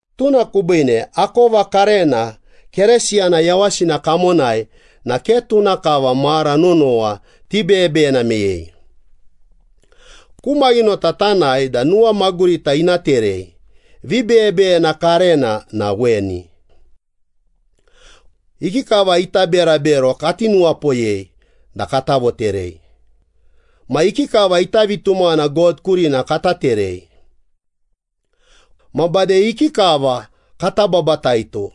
Tuna kubiine, akova karena Keresiyana yawasina kamonai na ke tuna kava mara nonowa tibeyebeyena meyei. Ku maghinota tanae da nuwamagurita ina terei. Vibeyebeyena karena na weni. Ikikava ita berabero kati nuwapoyei da kata voterei, ma ikikava ita vitumaghana God kurina kata terei. Ma bade ikikava kata babataito,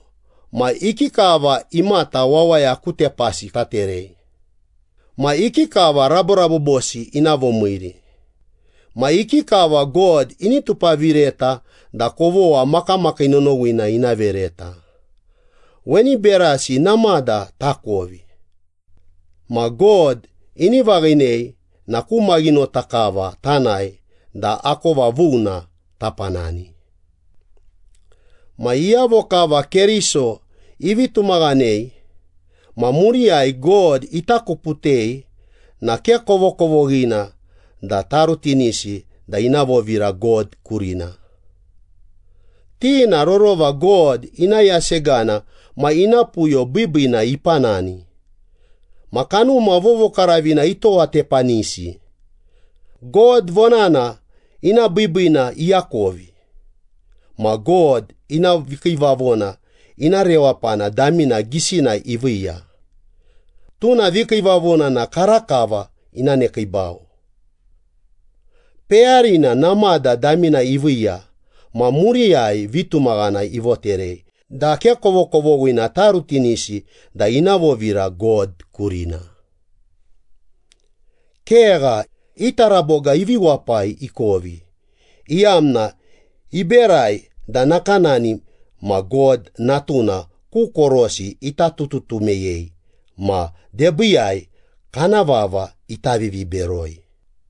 ma ikikava imata wawaya ku tepasi taterei, ma ikikava raborabobosi ina vomiiri, ma ikikava God ini tupavireta da kovogha makamakii nonowina ina vereta. Weni berasi namada takovi. Ma God ini vaghinei na ku maghinota kava tanae da akova vuna tapanani. Ma iyavo kava Keriso ivi tumaghanei ma muriyai God itakuputei na ke kovokovoghina da tarutinisi da ina vovira God kurina. Ti na rorova God ina yasegana ma ina puyo biibiina ipanani, ma Kanuma Vovokaravina itowatepanisi, God vonana ina biibiina iakovi, ma God ina vikiivavona ina rewapana damina gisina iviiya, tuna vikiivavona na karakava ina nekiibau. Peyarina namada damina iviiya ma muriyai vitumaghana ivoterei da ke kovokovoghina tarutinisi da ina vovira God kurina. Kegha, i taraboga ivi wapai ikovi, iyamna iberai da nakanani ma God Natuna ku korosi ita tututu meyei ma debiiyai kana vava ita viviberoi.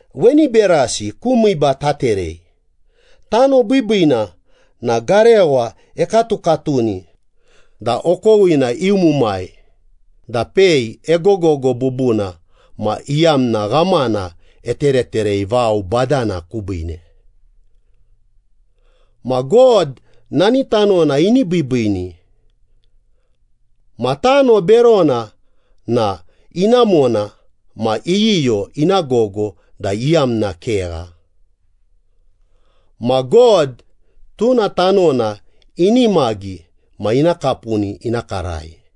Weni berasi ku miiba taterei. Tano biibiina na garewa ekatukatuni da okowina iumumai da pei egogogo bubuna ma iyamna ghamana etereterei vao badana kubiine. Ma God nani tanona ini biibiini. Ma tano berona na inamona ma iyiyo ina gogo da iyamna kegha. Ma God tuna tanona inimagi ma ina kapuni ina karai.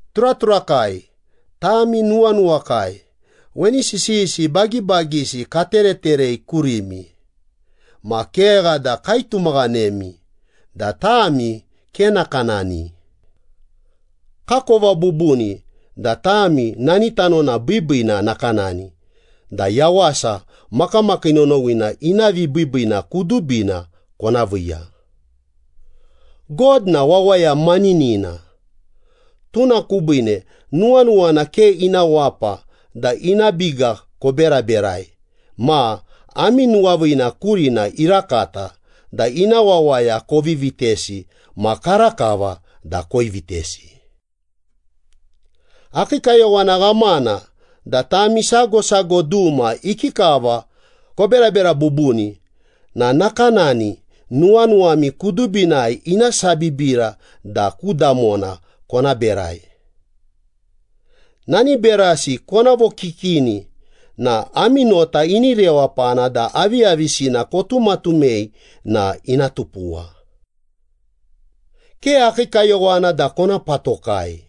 Turaturakai, tami nuwanuwakai, weni sisiyisi bagibagisi katereterei kurimi, ma kegha da kaitumaghanemi da tami ke nakanani. Kakova bubuni da tami nani tanona biibiina nakanani da yawasa makamakii nonowina ina vibiibiina kudubina kona viiya. God na wawaya maninina, tuna kubiine nuwanuwana ke ina wapa da ina biga koberaberai ma ami nuwaviina kurina irakata da ina wawaya kovi vitesi ma karakava da koivitesi. Akii kayowana ghamana da tami sago sago duma ikikava koberabera bubuni na nakanani nuwanuwami kudubina ina sabibira da ku damona kona berai. Nani berasi kona vokikini na ami nota ini rewapana da aviyavisina kotumatumei na ina tupuwa. Ke akii kayowana da kona patokai.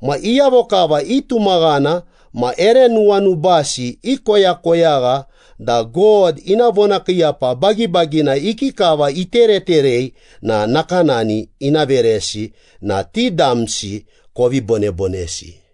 Ma iyavo kava itumaghana ma ere nuwanubasi ikoyakoyagha da God ina vonakiiyapa bagibagina ikikava itereterei na nakanani ina veresi na ti damsi kovi bonebonesi.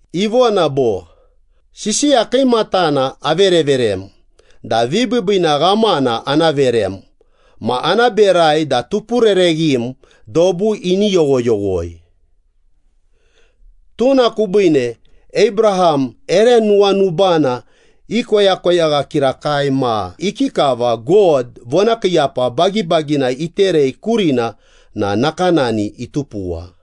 Ivona bo, “Sisiya kiimatana avereverem da vibiibiina ghamana ana verem ma ana berai da tupurereghim dobu ini yoghoyoghoi.” Tuna kubiine, Abraham ere nuwanubana ikoyakoyagha kirakai ma ikikava God vonakiiyapa bagibagina iterei kurina na nakanani itupuwa.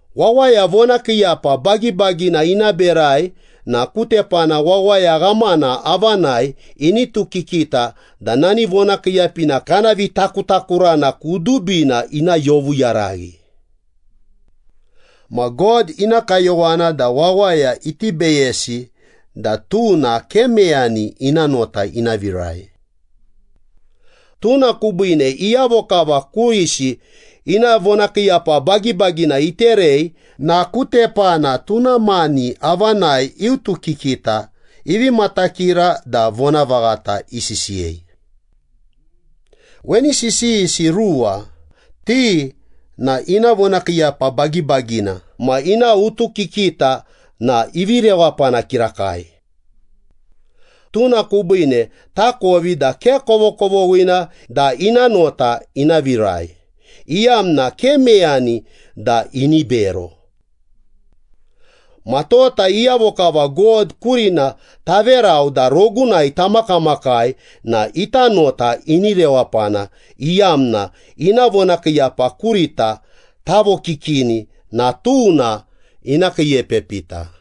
Wawaya vonakiiyapa bagibagina ina berai na ku tepana wawaya ghamana avanai initukikita da nani vonakiiyapina kana vitakutakurana kudubina ina yovuyaraghi. Ma God ina kayowana da wawaya iti beyesi da tuna ke meyani ina nota ina virai. Tuna kubiine iyavo kava kurisi ina vonakiiyapa bagibagina iterei na ku tepana tuna mani avanai iutukikita, ivi matakira da vonavaghata isisiyei. Weni sisiyisi ruwa, ti na ina vonakiiyapa bagibagina ma ina utukikita na ivi rewapana kirakai. Tuna kubiine takovi da ke kovokovoghina da ina nota ina virai, iyamna ke meyani da ini bero. Ma tota iyavo kava God kurina taverau da rogunai tamakamakai na ita nota ini rewapana, iyamna ina vonakiiyapa kurita tavokikini na tuna ina kiiepepita.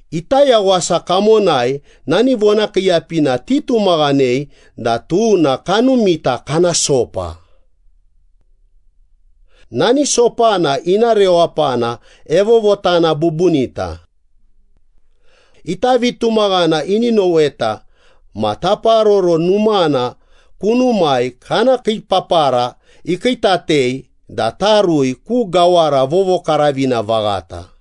Ita yawasa kamonai nani vonakiiyapina titumaghanei da tuna kanumita kana sopa. Nani sopana ina rewapana evovotana bubunita. Ita vitumaghana ini noweta ma taparoro numana kunumai kana kiipapara ikiitatei da tarui ku gawara vovokaravina vaghata.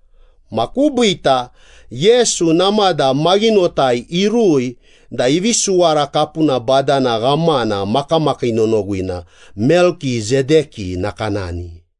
Ma kubiita Yesu namada maghinotai irui da ivi suwara kapuna badana ghamana makamakii nonowina, Melkisedeki nakanani.